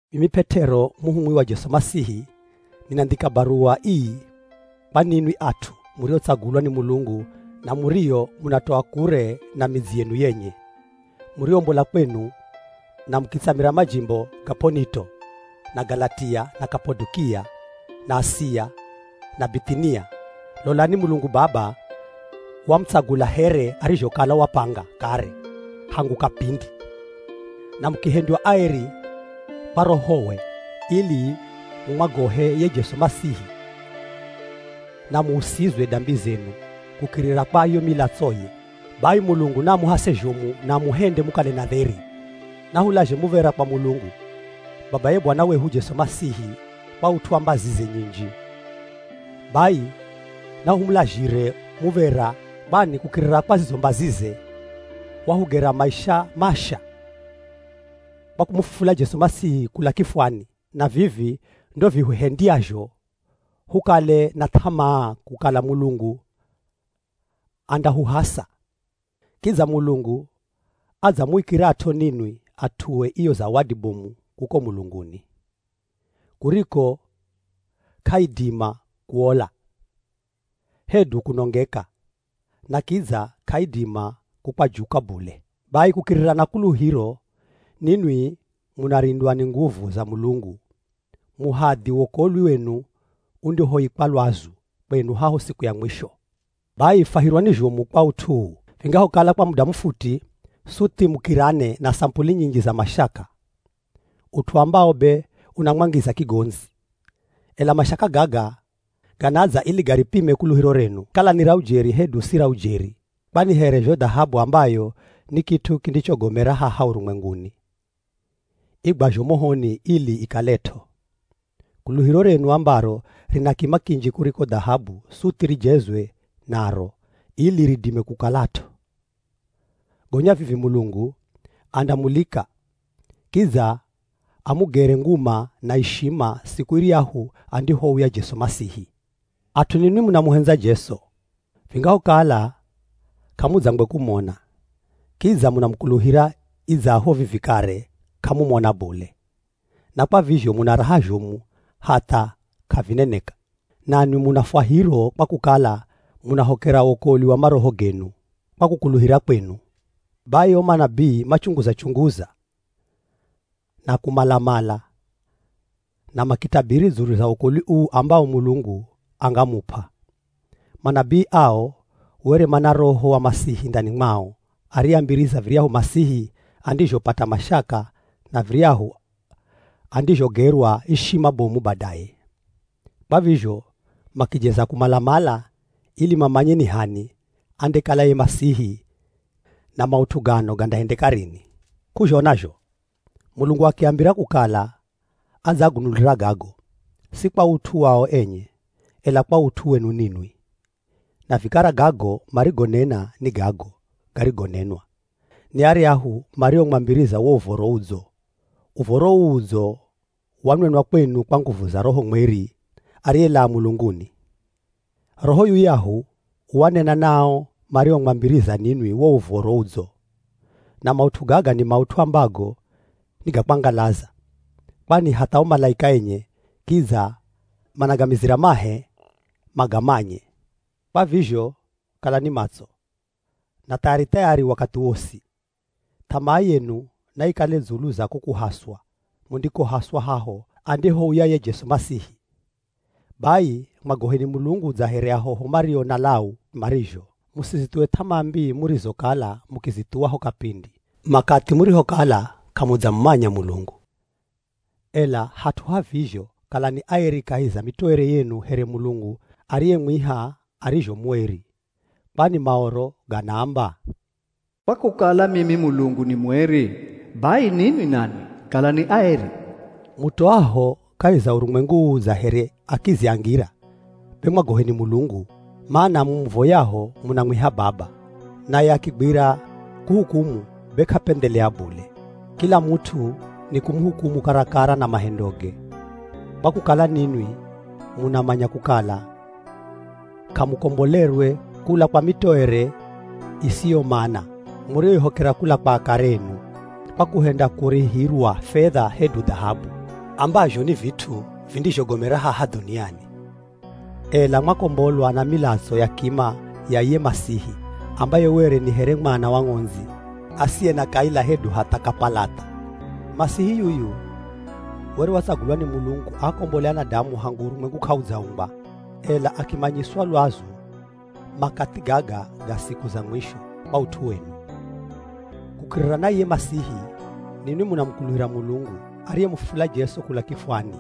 Mimi P'et'ero muhumwi wa Jesu Masihi, ninandhika baruwa ii kwa ninwi at'u muriotsagulwa ni Mulungu na murio munatoa kure na midzi yenu yenye; muriombola kwenu na mukitsamira majimbo ga P'onito, na Galatia, na Kapadokia, na Asia, na Bith'inia. Lolani, Mulungu Baba wamutsagula here arizhokala wapanga kare hangu kapindi, na mukihendywa aeri kwa Rohowe ili mumwagohe ye Jesu Masihi, na muusizwe dambi zenu kukirira kwa yo milatsoye. Bai Mulungu naamuhase zhomu na amuhende mukale na dheri. Nahulazhe muv̱era kwa Mulungu, babaye Bwana wehu Jesu Masihi kwa ut'u wa mbazize nyinji. Bai nahumulazhire muv̱era, kwani kukirira kwa zizo mbazize, wahugera maisha masha kwa kumufufula Jesu Masihi kula kifwani. Na vivi ndo vihuhendyazho hukale na th'amaa kukala Mulungu andahuhasa. Kidza Mulungu adzamuikirat'o ninwi at'ue iyo zawadi bomu kuko mulunguni, kuriko k'aidima kuola, hedu kunongeka, na kidza k'aidima kukwajuka bule. Bai kukirira na kuluhiro, ninwi munarindwa ni nguvu za Mulungu muhadhi wokolwi wenu undihoikwa lwazu kwenu haho siku ya mwisho. Bai fwahirwani zhomu kwa ut'u uu, vingahokala kwa muda mufuti suthi mukirane na samupuli nyinji za mashaka, ut'u ambawo be unamwangiza kigondzi. Ela mashaka gaga ganadza ili garipime kuluhiro renu, kala ni ra ujeri hedu si ra ujeri. Kwani here zho dhahabu ambayo ni kit'u kindichogomera haha urumwenguni, igwazho mohoni ili ikalet'o, kuluhiro renu ambaro rina kima kinji kuriko dhahabu suthi rijezwe naro ili ridime kukalat'o. Gonya vivi Mulungu andamulika, kidza amugere nguma na ishima siku iryahu andihouya Jesu Masihi. At'u ninwi munamuhendza Jesu, vingahokala k'amudzangwe kumona. Kidza munamukuluhira idzaho vivi kare k'amumona bule, na kwa vizho muna raha zhomu hatha k'avineneka. Nanwi muna fwahiro kwa kukala munahokera wokolwi wa maroho genu, kwa kukuluhira kwenu. Bai o manabii machunguza-chunguza na kumala-mala, na makitabiri dzulu za wokolwi uu ambawo Mulungu angamup'a. Manabii ao were mana Roho wa Masihi ndani mwao ariyeambiriza viryahu Masihi andizhopata mashaka na viryahu andizhogerwa ishima bomu badaye. Kwa vizho makijeza kumala-mala ili mamanye ni h'ani andekala ye Masihi, na maut'u gano gandahendeka rini. K'uzhona zho Mulungu akiambira kukala adzaagunulira gago, si kwa ut'u wao enye, ela kwa ut'u wenu ninwi. Na vikara, gago marigonena ni gago garigonenwa ni aryahu mariomwambiriza wo Uv̱oro Udzo. Uv̱oro uu udzo, wanenwa kwenu kwa nguvu za Roho Mweri ariyelaa mulunguni. Roho yuyahu wanena na ao mariomwambiriza ninwi wo Uv̱oro Udzo. Na maut'u gaga ni maut'u ambago ni ga kwangalaza, kwani hatha o malaika enye kidza managamizira mahe magamanye. Kwa vizho, kalani matso na thayari-thayari wakathi wosi. Th'amaa yenu naikale dzulu za ko kuhaswa mundikohaswa haho andihouya ye Jesu Masihi. Bai mwagoheni Mulungu dza here ahoho mario na lau marizho. Musizithuwe th'amaa mbii murizokala mukizithuwa ho kapindi makathi murihokala k'amudzamumanya Mulungu. Ela hat'u ha vizho, kalani aeri kahi za mitoere yenu here Mulungu ariyemwiha arizho mueri. Kwani Maoro ganaamba, “Kwa kukala mimi Mulungu ni mueri, bai ninwi nanwi kalani aeri.” Mutoaho kahi za urumwengu uu dza here akizi a ngira be mwagoheni Mulungu. Mana mumuvoyaho munamwiha Baba, naye akigwira kuhukumu be k'apendhelea bule. Kila mut'u ni kumuhukumu karakara na mahendoge. Kwa kukala ninwi munamanya kukala k'amukombolerwe kula kwa mitoere isiyomana muriyoihokera kula kwa akare enu, kwa kuhenda kurihirwa fedha hedu dhahabu, ambazho ni vit'u vindizhogomera haha dhuniani. Ela mwakombolwa na milatso ya kima ya iye Masihi ambaye were ni here mwana wa ng'ondzi asiye na kaila hedu hatha kapalatha. Masihi yuyu were watsagulwa ni Mulungu aakombole anadamu hangu urumwengu k'audzaumbwa, ela akimanyiswa lwazu makathi gaga ga siku za mwisho kwa ut'u wenu. Kukirira na iye Masihi, ninwi munamukuluhira Mulungu ariyemufufula Jesu kula kifwani,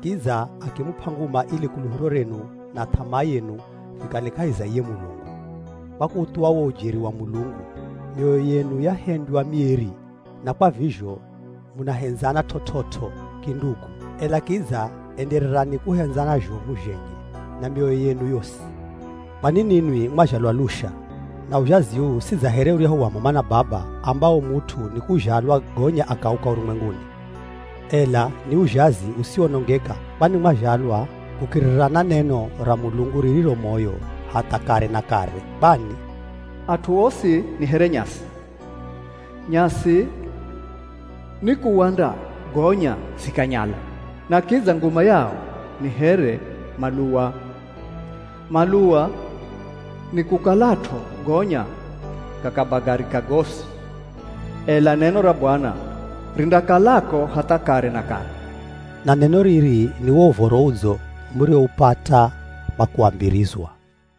kidza akimup'a nguma ili kuluhiro renu na th'amaa yenu vikale kahi za iye Mulungu. Kwa kuuthuwa wo ujeri wa Mulungu, mioyo yenu yahendywa mieri na kwa vizho munahendzana t'ot'ot'o kindugu. Ela kidza endererani kuhendzana zhomu zhenye na mioyo yenu yosi. Kwani ninwi mwazhalwa lusha, na uzhazi uu si dza here uryahu wa m'ama na baba ambawo mut'u ni kuzhalwa gonya akauka urumwenguni, ela ni uzhazi usiwonongeka. Kwani mwazhalwa kukirira na neno ra Mulungu ririro moyo hatha kare na kare. Kwani, “At'u osi ni here nyasi. Nyasi ni kuwanda gonya zikanyala, na kidza nguma yao ni here maluwa, maluwa ni kukalat'o gonya gakabagarika gosi. Ela neno ra Bwana rindakalako hatha kare na kare.” Na neno riri ni uwo Uv̱oro Udzo muriwoupata kwa kuambirizwa.